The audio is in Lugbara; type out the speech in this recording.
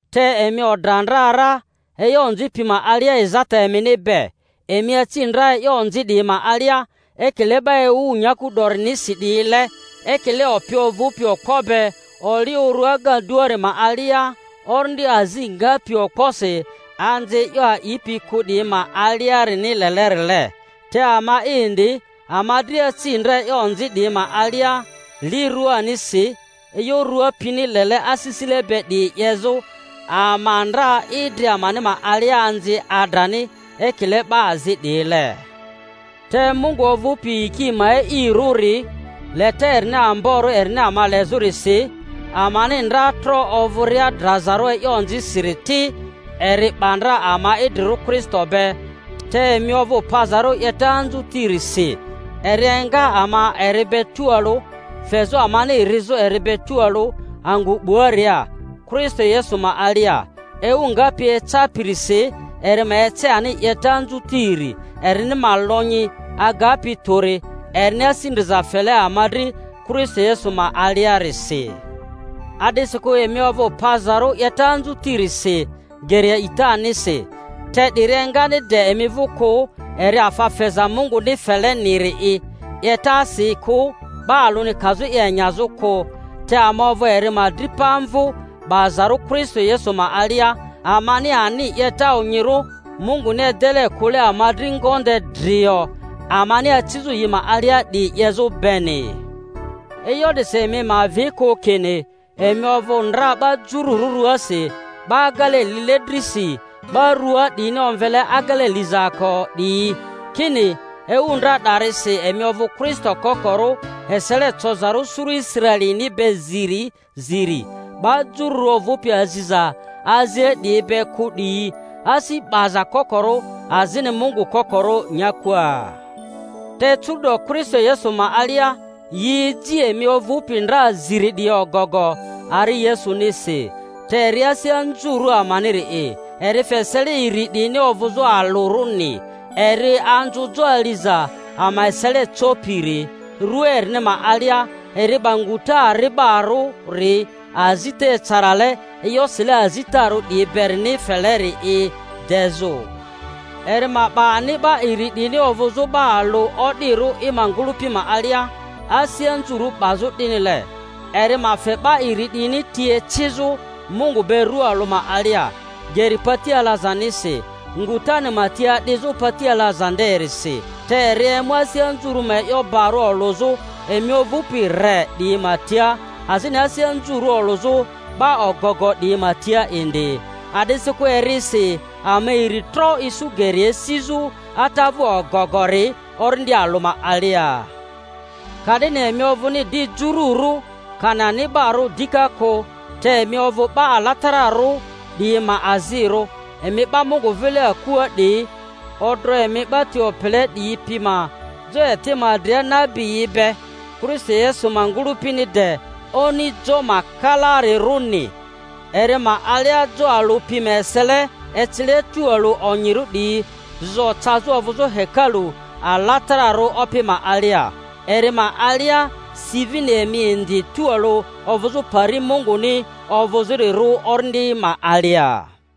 Te emi odra ndra ra e'yo onzi pi ma alia ezata emini be. Emi aci ndra e'yo onzi 'diyi ma alia, ekile 'ba ewu nyaku 'dorinisi 'diyile, ekile opi ovᴜpi okpo be oli uru agaduari ma alia, orindi azi ngapi okposi anzi e'yo a'ipi kᴜ 'diyi ma aliarini lelerile. Te ama'i indi, ama dria aci ndra e'yo onzi 'diyi ma alia li ruanisi, e'yo rua pini lele asisile be 'diyi 'yezᴜ; ama ndra idri amani ma alia anzi adrani, ekile 'ba azi 'diyile. Te Mungu ovᴜpi yiki ma e'irᴜri, leta erini amborᴜ erini ama lezᴜrisi, amani ndra tro ovᴜria drazarᴜ e'yo onzisiri ti, eri 'ba ndra ama idrirᴜ Kristo be (te emi ovᴜ pazarᴜ 'yeta anzutirisi), eri enga ama eri be tualᴜ, fezᴜ amani rizᴜ eri be tualᴜ angᴜ 'buaria, Kristo Yesu ma alia, ewu ngapi ecapirisi eri ma ece ani 'yeta anzutiri erini ma Ionyi agapi tᴜri, erini asi ndriza fele ama dri Kristo Yesu ma aliarisi. A'disikᴜ emi ovᴜ pazarᴜ 'yeta anzutirisi geri a'itanisi; te 'diri engani de emi vᴜ kᴜ, eri afa feza Munguni feleniri'i— 'yetasi kᴜ, 'ba alᴜni kazᴜ i enyazᴜ kᴜ. Te ama ovᴜ eri ma dripa-mvᴜ, 'bazarᴜ Kristo Yesu ma alia, amani ani 'yeta onyirᴜ Munguni edele kᴜle ama dri ngonde drio amani acizᴜ yi ma alia 'diyi 'yezᴜ beni. E'yo 'disi emi ma avi kᴜ kini emi ovᴜ ndra 'ba Jururᴜ rᴜasi, 'ba agele lile drisi 'ba rᴜaa 'diyini omvele agele lizaako 'diyi kini ewu ndra 'darisi emi ovᴜ Kristo kokorᴜ, esele cozarᴜ suru Israelini be ziri ziri, 'ba jururᴜ ovᴜpi aziza azile 'diyi be kᴜ 'diyi, asi 'baza kokorᴜ azini Mungu kokorᴜ nyakua. Te curu'do Kristo Yesu ma alia yi eji emi ovᴜpi ndra ziri 'diyi ogogo ari Yesunisi. Te eri asi anzurᴜ amaniri'i, eri fe esele iri 'diyini ovᴜzᴜ alᴜrᴜni, eri anzᴜ jo aliza ama esele copiri, rᴜa erini ma alia eri 'ba nguta ari'barᴜri azita ecarale e'yo sile azitarᴜ 'diyi berini feleri i dezᴜ, eri ma 'ba ani 'ba iri 'diyini ovᴜzᴜ 'ba alᴜ o'dirᴜ i ma ngᴜlᴜpi ma alia, asi anzurᴜ 'bazᴜ 'dinile, eri ma fe 'ba iri 'diyini ti ecizᴜ Mungu be rᴜa alᴜ ma alia, geri pati alazanisi, ngutani ma ti adizᴜ pati alaza nde-risi. Te eri emu asi anzurᴜ ma e'yo barᴜ olᴜzᴜ emi ovᴜpi re 'diyi ma tia, azini asi anzurᴜ olᴜzᴜ 'ba ogogo 'diyi ma tia indi; a'disikᴜ erisi ama iri tro isu geri esizᴜ Ata vᴜ ogogori Orindi alᴜ ma alia. Ka-'dini emi ovᴜni di jururᴜ, kani ani'barᴜ dika kᴜ. te emi ovᴜ 'ba alatara-rᴜ 'diyi ma azirᴜ, emi 'ba Mungu vile akua 'diyi, odro emi 'ba ti opele 'diyi pi ma jo eti ma dria nabiyi be, Kristo Yesu ma ngᴜlᴜpini de oni jo ma kalaarirᴜni; eri ma alia jo alᴜ pi ma esele, ecile tualᴜ onyirᴜ 'diyi, zo cazᴜ ovᴜzᴜ hekalu alatararᴜ Opi ma alia; eri ma alia si vini emi indi tualᴜ ovᴜzᴜ pari Munguni ovᴜzᴜrirᴜ Orindi ma alia.